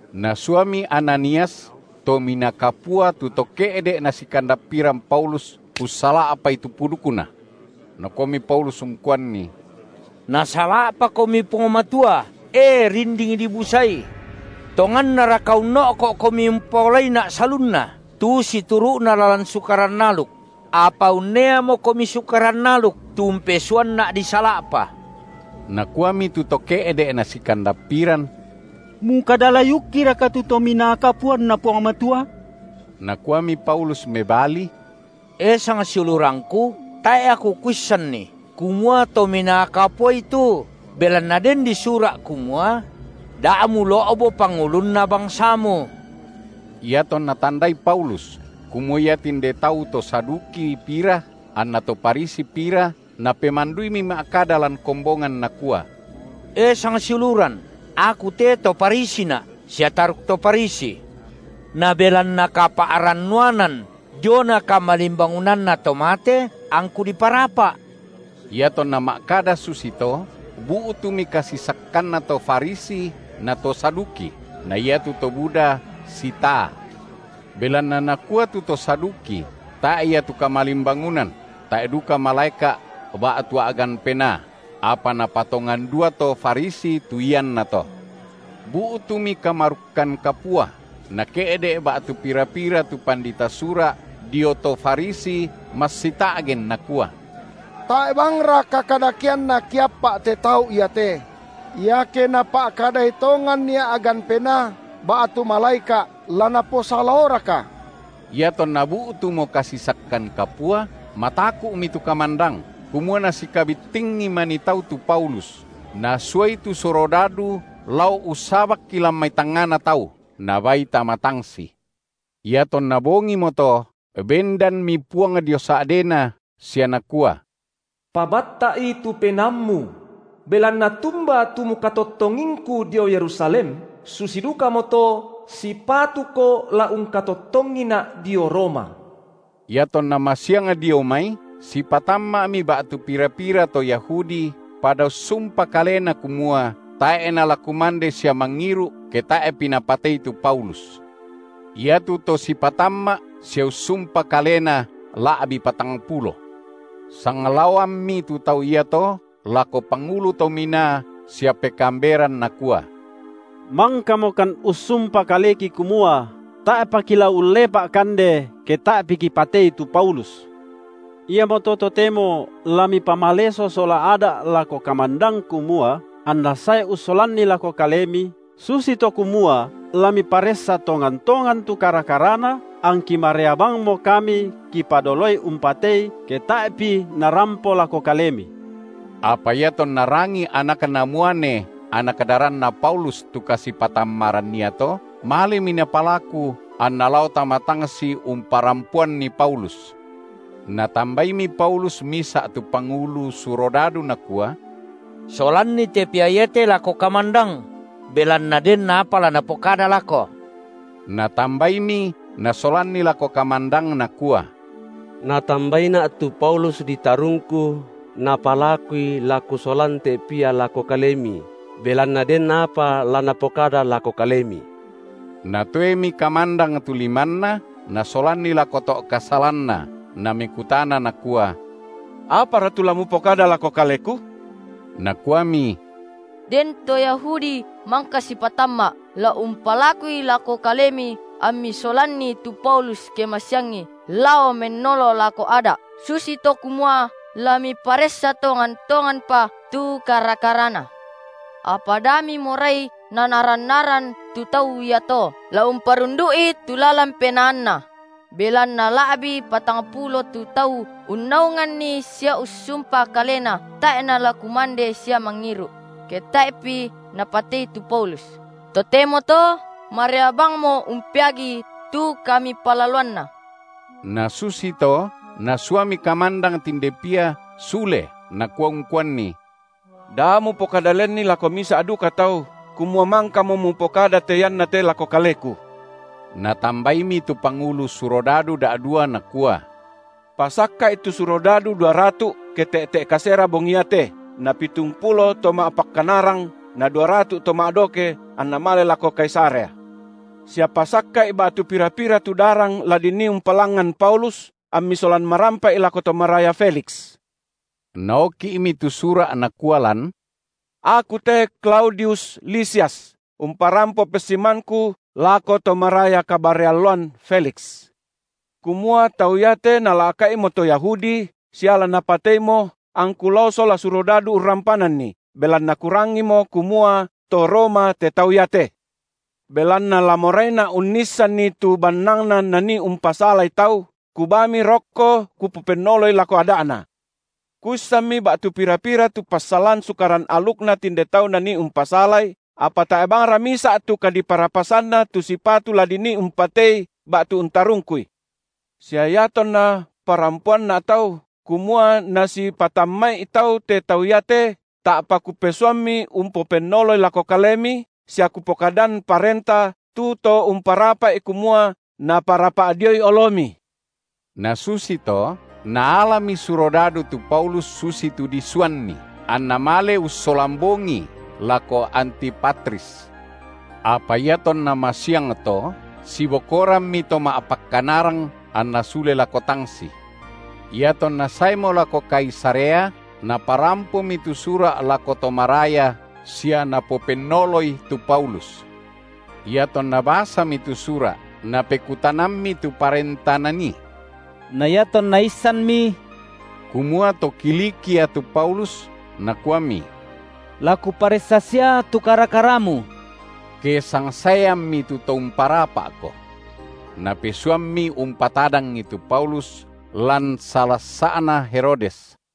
Nasuami Ananias, Tominaa Kapua tu to ke’ de’ nasikandappiran Paulus ussala’pai tu pudukna. Nakuami Paulus ungkuanni: Nasala’pakomi Puang Matua, e! rinding dibusai. Tongannaraka unno’ko’komi umpaolaina’ salunna, tu situru’na lalan Sukaran aluk? apa unneamokomi Sukaran aluk tu umpesuanna’ disala’pa. Nakuami tu to ke’de’ nasikandappiran: Mukada-layukkiraka tu Tominaa KapuanNa Puang Matua? Nakuami Paulus mebali: E sangsiulurangku, tae’ aku kuissanni kumua Tominaa Kapuai tu; belanna den di sura’ kumua: Da mulo’bo pangulunna bangsamu. Iatonna tandai Paulus kumua ia tinde tau to Saduki pira anna to Farisi pira, napemanduimi ma’kada lan kombongan nakua: E sangsiuluran, aku te to Farisina’ sia taruk to Farisi. Na belanna kapa’rannuanan diona kamalimbangunanna to mate, angku diparapa’. Iatonna ma’kada susito, bu’tumi kasisakkanna to Farisi na to Saduki, na iatu to buda sitaa. Belanna nakua tu to Saduki, tae’ ia tu kamalimbangunan, tae’ duka malaeka’ ba’tu a’gan penaa; apa napatongan dua to Farisi tu iannato. Bu’tumi kamarukkan kapua, nake’de’ ba’tu pira-pira tu pandita Sura’ dio to Farisi massita’gen nakua: Tae’ bangra kakadakeanna kiappa’ te tau iate; iake napa’kadai tongannia’gan penaa ba’tu malaeka’, la naposalaoraka? Iatonna bu’tumo kasisakkan kapua, mataku’mi tu kamandang, kumua nasikabittingi manii tau tu Paulus, nasuai tu surodadu lao ussabakki lan mai tangngana tau, nabaai tama tangsi. Iatonna bongimoto, bendanmi Puang dio sa’dena sia Nakua: Pabatta’i tu penaammu! Belanna tumba tu kamukatottongingKu dio Yerusalem, susi dukamoto sipatuko la ungkatottongiNa’ dio Roma. Iatonna masiang dio mai, sipatamma’mi ba’tu pira-pira to Yahudi, pada ussumpa kalena kumua, tae’ nala kumande sia mangiru’ ke tae’pi napatei tu Paulus. Iatu to sipatamma’ sia ussumpa kalena la’bi patangpulo. Sanglaoammi tu tau iato lako pangulu to minaa sia pekaamberan nakua: Mangkamokan ussumpa kaleki kumua tae’pa kila ullepa’ kande, ke tae’pi kipatei tu Paulus. Iamoto totemo la mipamaleso sola Ada’ lako kamandang kumua anna sae ussolanni lako kalemi, susito kumua la miparessa tongan-tongan tu kara-karana, angki marea bangmo kami kipadoloi umpatei ke tae’pi narampo lako kalemi. Apa iatonna rangii anakna muane anak daranna Paulus tu kasipatammaran iato, malemi napalaku anna lao tama tangsi umparampoanni Paulus. Natambaimi Paulus misa’ tu pangulu surodado nakua: Solanni te pia iate lako kamandang; belanna den apa la napokada lako. Natambaimi nasolanni lako kamandang nakua: Natambaina’ tu Paulus ditarungku napalakui la kusolan te pia lako kalemi belanna den apa la napokada lako kalemi. Natoemi kamandang tu limanna, nasolanni lako to’ kasalanna, namekutana nakua: Apara tu la mupokada lako kaleku? Nakuami: Den to Yahudi mangka sipatamma’ la umpalakui lako kalemi ammi solanni tu Paulus ke masiangi lao mennolo lako Ada’ susito kumua la miparessa tonga-tonganpa tu kara-karana. Apa da mimorai nanaran-naran tu tau iato la umparundu’i tu lalan penaanna, belanna la’bi patangpulo tu tau unnaunganni sia ussumpa kalena tae’ nala kumande sia mangiru’, ke tae’ pi napatei tu Paulus; totemoto marea bangmo umpeagii tu kamipalaloanna. Nasusito nasuami kamandang tinde pia sule nakua ungkuanni: Da mupokada lenni lako misa’ duka tau, kumua mangkamo mupokada te iannate lako kaleku. Natambaimi tu pangulu surodadu da’dua nakua: Pasakka’i tu surodadu duaratu’, ke te’te’ kasera bongi iate, na pitungpulo to ma’pakkanarang, na duaratu’ to ma’doke anna male lako Kaisarea. Sia pasakka’i ba’tu pira-pira tu darang la dinii umpalangngan Paulus, ammi solan marampa’i lako to maraya Feliks. Naoki’mi tu sura’ nakua lan: Aku te Klaudius Lisias, umparampo pessimanku iako to maraya kabarre alloan Feliks. Kumua tau iate nala’ka’imo to Yahudi, sia la napateimo angku lao sola surodadu urrampananni, belanna kurangimo kumua to Roma te tau iate. Belanna la moraina’ unnissanni tu bannangna nanii umpasalai tau, kubaami rokko kupopennoloi lako Ada’na. Kuissanmi ba’tu pira-pira tu passalan Sukaran alukna tinde tau nanii umpasalai, apa tae’ bangra misa’ tu kadiparapasanna tu sipatu la dinii umpatei ba’tu untarungkui. Sia iatonna parampoanna’ tau, kumua nasipatamma’i tau te tau iate, ta’pa kupesuammi umpopennoloi lako kalemi, sia kupokadan parenta tu to umparapa’i kumua naparapa’ dioi olomi. Nasusito, naalani surodadu tu Paulus susitu disuanni, anna male ussolan bongii lako Antipatris. Apa iatonna masiangto, sibokorammi to ma’pakkanarang anna sule lako tangsi. Iatonna saemo lako Kaisarea, naparampomi tu sura’ lako to maraya sia napopennoloi tu Paulus. Iatonna basami tu sura’, napekutanammi tu parenta nanii; na iatonna issanmi, kumua to Kilikia tu Paulus, nakuami: La kuparessa sia tu kara-karamu, ke sangsaeammi tu to umparapa’ko. Napesuammi umpatadangi tu Paulus lan salassa’na Herodes.